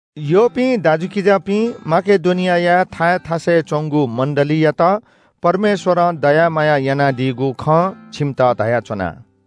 यःपिं दाजुकिजापिं, माकेडोनियाया थाय् थासय् च्‍वंगु मण्‍डलीयात परमेश्‍वरं दया माया यानादीगु खँ छिमित धयाच्‍वना।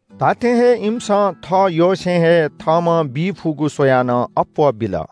धात्‍थें हे इमिसं थःयसें हे थःम्‍हं बी फुगु स्‍वयाः नं अप्‍वः बिल।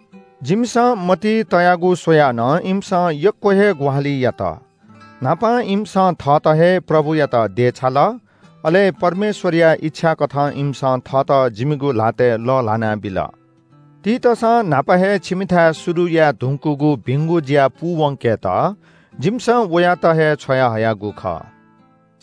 जिमिसं मतिइ तयागु स्‍वयाः नं इमिसं यक्‍व हे ग्‍वाहालि यात। न्‍हापां इमिसं थःत हे प्रभुयात देछाल, अले परमेश्‍वरया इच्‍छा कथं इमिसं थःत जिमिगु ल्‍हातय् लःल्‍हाना बिल। तीतसं न्‍हापा हे छिमिथाय् शुरु याये धुंकूगु भिंगु ज्‍या पूवंकेत जिमिसं वयात हे छ्वयाहयागु खः।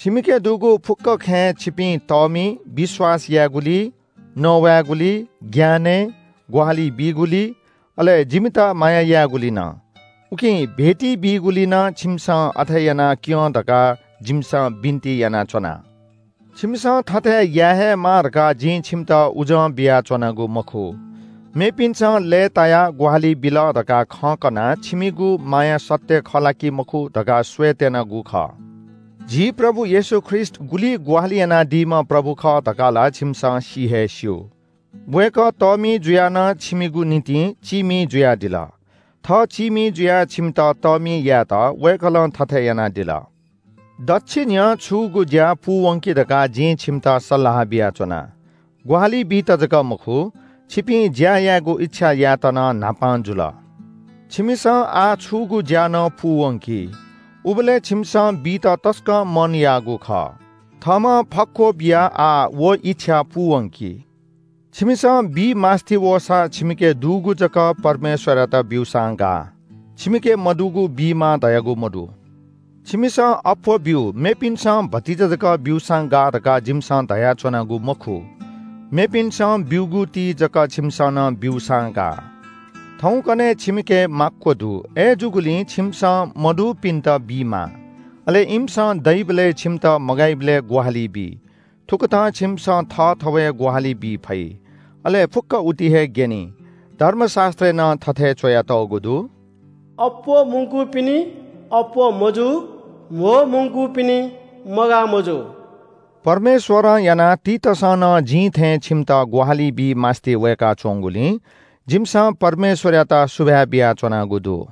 छिमिके दुगु फुक्‍क खँय् छिपिं तःमि, विश्‍वास यायेगुलिइ, नवायेगुलिइ, ज्ञानय्, ग्‍वाहालि बीगुलिइ अले जिमित माया यायेगुलिइ नं। उकिं भेटी बीगुलिइ नं छिमिसं अथे याना क्‍यँ धकाः जिमिसं बिन्‍ति यानाच्‍वना। छिमिसं थथे याये हे माः धकाः जिं छिमित उजं बियाच्‍वनागु मखु। मेपिन्‍सं लय्‌तायाः ग्‍वाहालि बिल धकाः खँ कनाः छिमिगु माया सत्‍य खः ला कि मखु धकाः स्‍वयेत्‍यनागु खः। झी प्रभु येशू ख्रीष्‍ट गुलि ग्‍वाहालि यानादीम्‍ह प्रभु खः धकाः ला छिमिसं सि हे स्‍यू। वय्‌कः तःमि जुयाः नं छिमिगु निंतिं चीमि जुयादिल। थः चीमि जुयाः छिमित तःमि यायेत वय्‌कलं थथे यानादिल। दच्‍छि न्‍ह्यः छूगु ज्‍या पूवंकि धकाः जिं छिमित सल्‍लाह बियाच्‍वना। ग्‍वाहालि बीत जक मखु, छिपिं ज्‍या यायेगु इच्‍छा यायेत नं न्‍हापां जुल। छिमिसं आः छूगु ज्‍या नं पूवंकि। उबलय् छिमिसं बीत तसकं मन याःगु खः। थःम्‍हं फक्‍व बियाः आः व इच्‍छा पूवंकि। छिमिसं बी मास्‍ति वःसा छिमिके दुगु जक परमेश्‍वरयात ब्‍यूसां गाः, छिमिके मदुगु बीमाः धयागु मदु। छिमिसं अप्‍वः ब्‍यु, मेपिन्‍सं भतिचा जक ब्‍यूसां गाः धकाः जिमिसं धयाच्‍वनागु मखु। मेपिन्‍सं ब्‍यूगु ति जक छिमिसं नं ब्‍यूसां गाः। थौकन्‍हय् छिमिके माक्‍व दु। अय्‌जूगुलिं छिमिसं मदुपिन्‍त बीमाः। अले इमिसं दइबलय् छिमित मगाइबलय् ग्‍वाहालि बी। थुकथं छिमिसं थःथवय् ग्‍वाहालि बी फइ। अले फुक्‍क उति हे ग्‍यनी। धर्मशास्‍त्रय् नं थथे च्‍वयातःगु दु – “अप्‍वः मुंकूपिनि अप्‍वः मजू। कम मुंकूपिनि मगाः मजू।” परमेश्‍वरं यानाः तीतसं नं जिं थें छिमित ग्‍वाहालि बी मास्‍ति वय्‌काच्‍वंगुलिं जिमिसं परमेश्‍वरयात सुभाय् बियाच्‍वनागु दु।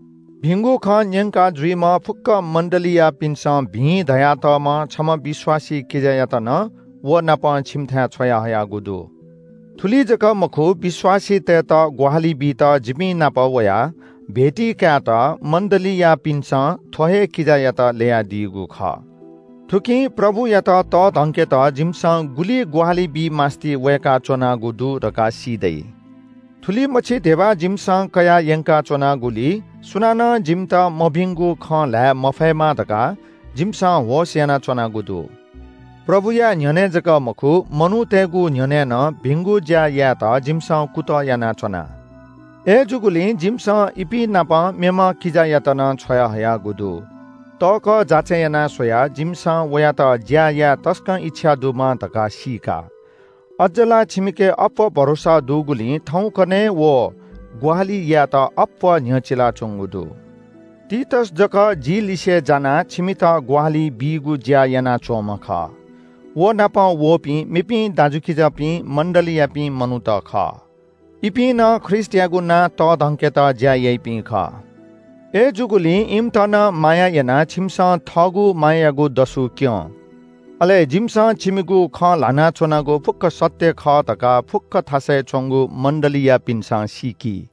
भिंगु खँ न्‍यंकाः जुइम्‍ह फुक्‍क मण्‍डलीयापिन्‍सं भिं धयातःम्‍ह छम्‍ह विश्‍वासी किजायात नं व नाप छिमिथाय् छ्वयाहयागु दु। थुलि जक मखु, विश्‍वासीतय्‌त ग्‍वाहालि बीत जिपिं नाप वयाः भेटी कायेत मण्‍डलीयापिन्‍सं थ्‍व हे किजायात ल्‍ययादीगु खः। थुकिं प्रभुयात तःधंकेत जिमिसं गुलि ग्‍वाहालि बी मास्‍ति वय्‌काच्‍वनागु दु धकाः सी दइ। थुलिमछि धिबा जिमिसं कयाः यंकाच्‍वनागुलिइ सुनानं जिमित मभिंगु खँ ल्‍हाये मफयेमा धकाः जिमिसं होश यानाच्‍वनागु दु। प्रभुया न्‍ह्यःने जक मखु, मनूतय्‌गु न्‍ह्यःने नं भिंगु ज्‍या यायेत जिमिसं कुतः यानाच्‍वना। अय्‌जूगुलिं जिमिसं इपिं नाप मेम्‍ह किजायात नं छ्वयाहयागु दु। तःकः जाँचय् यानाः स्‍वयाः जिमिसं वयात ज्‍या याये तसकं इच्‍छा दुम्‍ह धकाः सीका। अज्‍ज ला छिमिके अप्‍वः भरोसा दुगुलिं थौंकन्‍हय् व ग्‍वाहालि यायेत अप्‍वः न्‍ह्यचिलाच्‍वंगु दु। तीतस जक जि लिसे जानाः छिमित ग्‍वाहालि बीगु ज्‍या यानाच्‍वंम्‍ह खः। व नाप वःपिं मेपिं दाजुकिजापिं मण्‍डलीयापिं मनूत खः, इपिं नं ख्रीष्‍टयागु नां तःधंकेत ज्‍या याइपिं खः। अय्‌जूगुलिं इमित नं माया यानाः छिमिसं थःगु मायायागु दसु क्‍यँ। अले जिमिसं छिमिगु खँ ल्‍हाना च्‍वनागु फुक्‍क सत्‍य खः धकाः फुक्‍क थासय् च्‍वंगु मण्‍डलीयापिन्‍सं सीकी।